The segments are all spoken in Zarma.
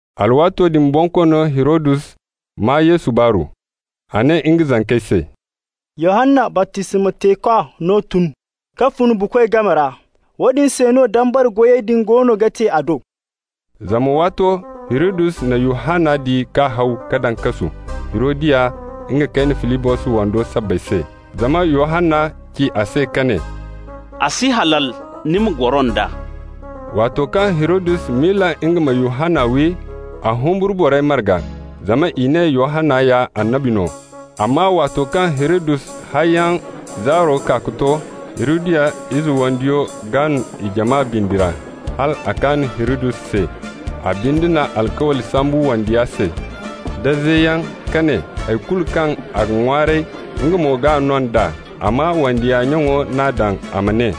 Alwaato din Bonkoono Hirodus maa Yesu baaru. A ne nga zankey se: «Yohanna baptisma teekwa no tun ka fun buukoy game ra, woodin se no dabari goyey din goono ga te a do.» Zama waato Hirodus na Yohanna di k'a haw, k'a daŋ kasu Hirodiya nga kayne Filibos wando sabbay se. Zama Yohanna ci a se ka ne: «A si halal ni ma goro nd'a.» Waato kaŋ Hirodus miila nga ma Yohanna wi, a humburu borey marga, zama i ne Yohanna ya annabi no. Amma waato kaŋ Hirodus hayyaŋ zaaro kaa ka to, Hirodiya ize wandiyo gaan i jama bindi ra, hal a kaan Hirodus se. A binde na alkawli sambu wandiya se da zeyaŋ ka ne hay kulu kaŋ a ga ŋwaaray, nga mo g'a no nd'a. Amma wandiya nyaŋo n'a daŋ a ma ne: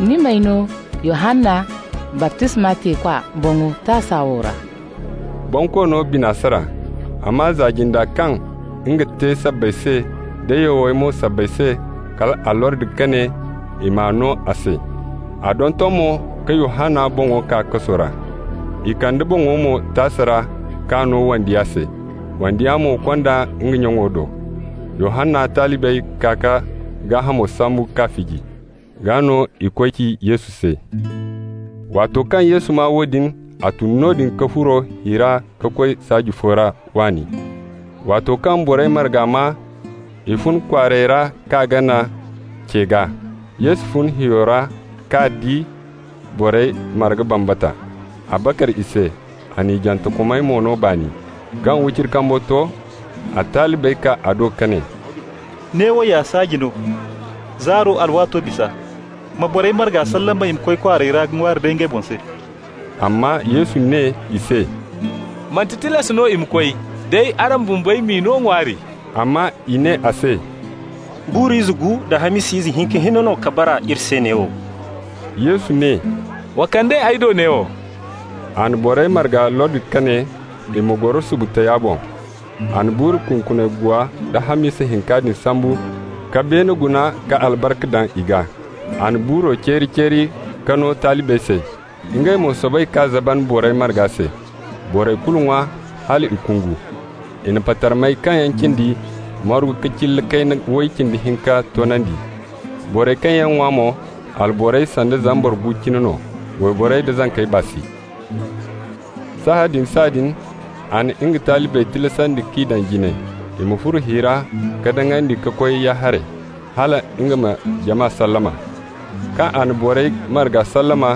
«Ni m'ay no Yohanna baptisma teekwa boŋo taasa wo ra.» Bonkoono bina sara, amma za-jinda kaŋ nga te sabbay se, da yawey mo sabbay se, kal a lordi ka ne i m'a no a se. A donton mo ka Yohanna boŋo kaa kaso ra. I kande boŋo mo taasa ra k'a no wandiya se, wandiya mo kond'a nga nyaŋo do. Yohanna talibey kaa k'a gaahamo sambu k'a fiji. Gaa no i koy ci Yesu se. Waato kaŋ Yesu maa woodin, a tun noodin ka furo hi ra ka koy saaji fo ra waani. Waato kaŋ borey margey maa, i fun kwaarey ra k'a gana ce gaa. Yesu fun hiyo ra ka di borey marga bambata. A bakar i se, a n'i jantekomey mo no baani. Kaŋ wiciri kambo to a talibey kaa a do ka ne: «Neewo ya saaji no, zaaro alwaato bisa. Ma borey marga sallama i ma koy kwaarey ra ka ŋwaari day ngey boŋ se.» Amma Yesu ne i se: «Manti tilas no i ma koy, day araŋ bumbey m'i no ŋwaari.» Amma i ne a se: «Buuru ize gu da hamisa ize hinka hinne no ka bara iri se neewo.» Yesu ne: «Wa kand'ey ay do neewo.» A na borey marga lordi ka ne i ma goro subu taya boŋ. A na buuru kunkuni guwa da hamisa hinka din sambu ka beene guna ka albarka daŋ i gaa. A na buuro ceeri-ceeri ka no talibey se, ngey mo soobay k'a zaban borey marga se. Borey kulu ŋwa hal i kungu. I na patarmey kaŋ yaŋ cindi margu ka cilla kayna way cindi hinka toonandi. Borey kaŋ yaŋ ŋwa mo, alborey sanda zambar gu cine no, wayborey da zankey baa si. Sahãadin-sahãadin a na nga talibey tilasandi k'i daŋ jine i ma furo hi ra ka daŋandi ka koy ya-haray, hala nga ma jama sallama. Kaŋ a na borey marga sallama,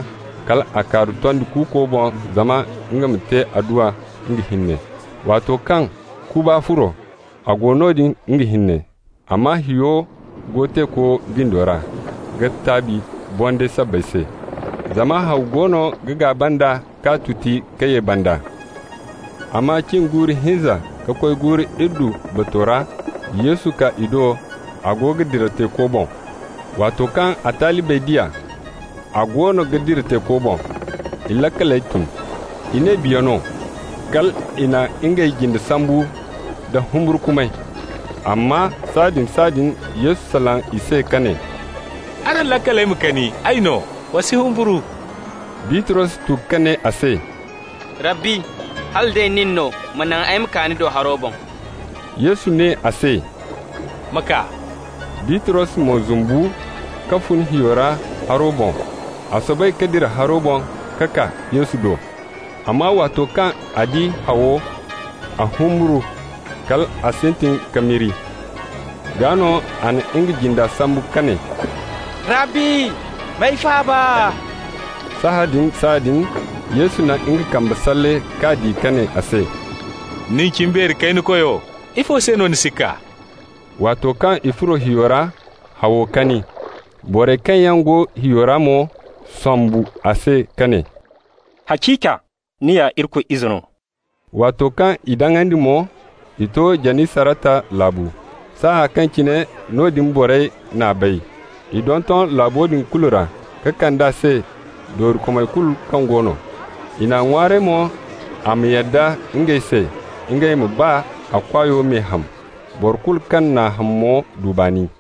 kal a kaaru tondi kuuko boŋ zama nga ma te adduwa nga hinne. Waato kaŋ kuba furo, a go noodin nga hinne. Amma hiyo go teeko bindi ra ga taabi bondayey sabbay se, zama haw goono ga gaaba nd'a k'a tuti ka ye banda. Amma cin guuru hinza ka koy guuru iddu bato ra Yesu kaa i do, a go ga dira teeko boŋ. Waato kaŋ a talibey di a, a goono ga dira teeko boŋ, i laakaley tun. I ne biya no. Kal i na ngey jinde sambu nda humburkumay. Amma sahãadin-sahãadin Yesu salaŋ i se ka ne: «Araŋ laakaley ma kani, ay no! Wa si humburu.» Bitros tu ka ne a se: «Rabbi, hala day nin no, ma naŋ ay ma kaa ni do haro boŋ.» Yesu ne a se: «Ma kaa!» Bitros mo zumbu ka fun hiyo ra haro boŋ, a soobay ka dira haro boŋ ka kaa Yesu do. Amma waato kaŋ a di hawo, a humburu, kal a sintin ka miri. Gaa no a na nga jinda sambu ka ne: «Rabbi, m'ay faaba!» Sahãadin-sahãadin Yesu na nga kambe salle k'a di ka ne a se: «Nin, cimbeeri kayna koyo! Ifo se no ni sikka?» Waato kaŋ i furo hiyo ra, hawo kani. Borey kaŋ yaŋ go hiyo ra mo sombu a se ka ne: «Haciika ni ya Irikoy Ize no.» Waato kaŋ i daŋandi mo, i to Janisarata laabu. Saaya kaŋ cine noodin borey n'a bay, i donton laabo din kulu ra, ka kand'a se doorikomey kulu kaŋ go no. I n'a ŋwaaray mo a ma yadda ngey se ngey ma baa a kwaayo me ham. Boro kulu kaŋ n'a ham mo du baani.